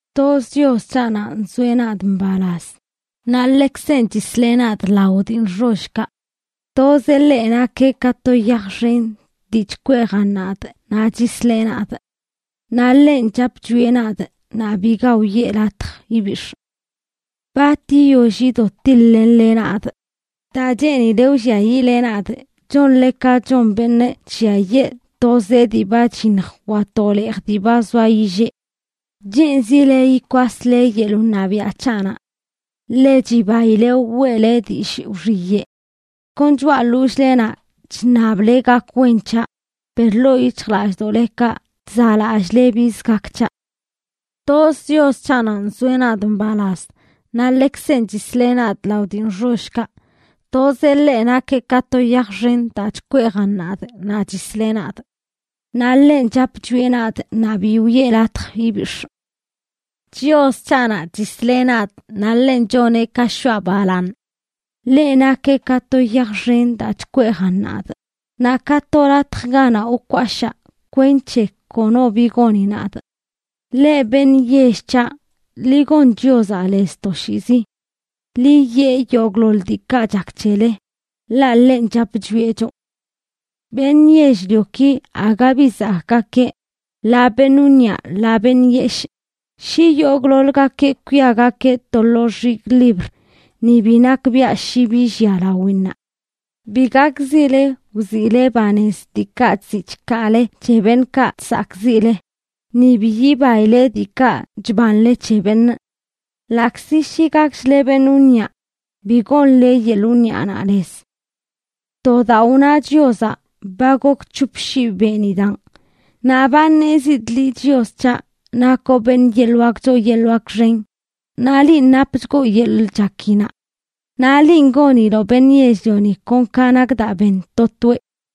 Toz Chios c̱haꞌnaꞌ nzoeꞌ nadꞌ mbalaz; naꞌ ḻekzenꞌ chisleꞌ nadꞌ lao dii nxollkaꞌ. Tozeꞌ ḻeꞌ nakeꞌ ka to yaj xen dii chkweejan nadꞌ naꞌ chisleꞌ nadꞌ. Naꞌ ḻenꞌ chap chwieꞌ nadꞌ naꞌ biga wiꞌe latj ibix̱ꞌ. ¿Bat yiyoll yido tiḻ-lenle nadꞌ? Daa cheenile wlliayiꞌle nadꞌ chonle ka chon beṉꞌ chlliayee to zee dii ba chyiṉj wa to leej dii ba zoa yillee. Cheenzile yikwasle yeḻꞌ wṉabiaꞌ c̱haꞌnaꞌ. Ḻe chibaile weꞌle dillꞌ wxiyeꞌ; kon choꞌa ḻollꞌlenaꞌ chṉable gak wen c̱haꞌ, per ḻoo yic̱hjlallꞌdoꞌlekaꞌ chzaꞌlallꞌle biz gak c̱haꞌ. Toz Chios c̱haꞌnanꞌ nzoeꞌ nadꞌ mbalaz; naꞌ ḻekzenꞌ chisleꞌ nadꞌ lao dii nxollkaꞌ. Tozeꞌ ḻeꞌ nakeꞌ ka to yaj xen daa chkweejan nadꞌ naꞌ chisleꞌ nadꞌ. Naꞌ ḻenꞌ chap chwieꞌ nadꞌ naꞌ bi wiꞌe latj ibix̱ꞌ. Chios c̱haꞌnaꞌ chisleꞌ nadꞌ naꞌ ḻenꞌ choneꞌ ka shoꞌa balaaṉ. Ḻeꞌ nakeꞌ ka to yaj xen daa chkweejan nadꞌ, naꞌ ka to latj ganaꞌ wkwashaa kwenc̱he kono bi goni nadꞌ. Leꞌ beṉꞌ yell c̱haꞌ, ḻi gon Chiozaꞌ lez toshiizi. Ḻi yee yogꞌḻoḻ diikaꞌ chak c̱hele, ḻaꞌ ḻenꞌ chap chwieꞌ choꞌ. Beṉꞌ yell-lioki aga bi zakꞌgakeꞌ, ḻaa beṉꞌ wniꞌa ḻaa beṉꞌ yeshꞌ. Shi yogꞌḻoḻgakeꞌ kwiagakeꞌ to lo xigꞌ libr ni bi nakbiaꞌ shi bi llia lawinnaꞌ. Bi gakzile wziꞌle banez diikaꞌ chziꞌ chkaale c̱he beṉꞌkaꞌ chsakꞌziꞌle, ni bi yibaile diikaꞌ chbanle c̱he beṉꞌ. Ḻaꞌkzi shi gakchle beṉꞌ wniꞌa, bi gonle yeḻꞌ wniꞌanaꞌ lez. To daa wna Chiozaꞌ, ba gok c̱hop shii benidaꞌn, naꞌ ba ṉezidꞌ liꞌ Chios c̱haꞌ, nakoꞌ beṉꞌ yeḻꞌ wak choo yeḻꞌ wak xen, naꞌ linꞌ napchgoꞌ yeḻꞌ chakinaꞌ. Naꞌ linꞌ goniloꞌ beṉꞌ yell-lioni kon ka nak daa ben to toeꞌ.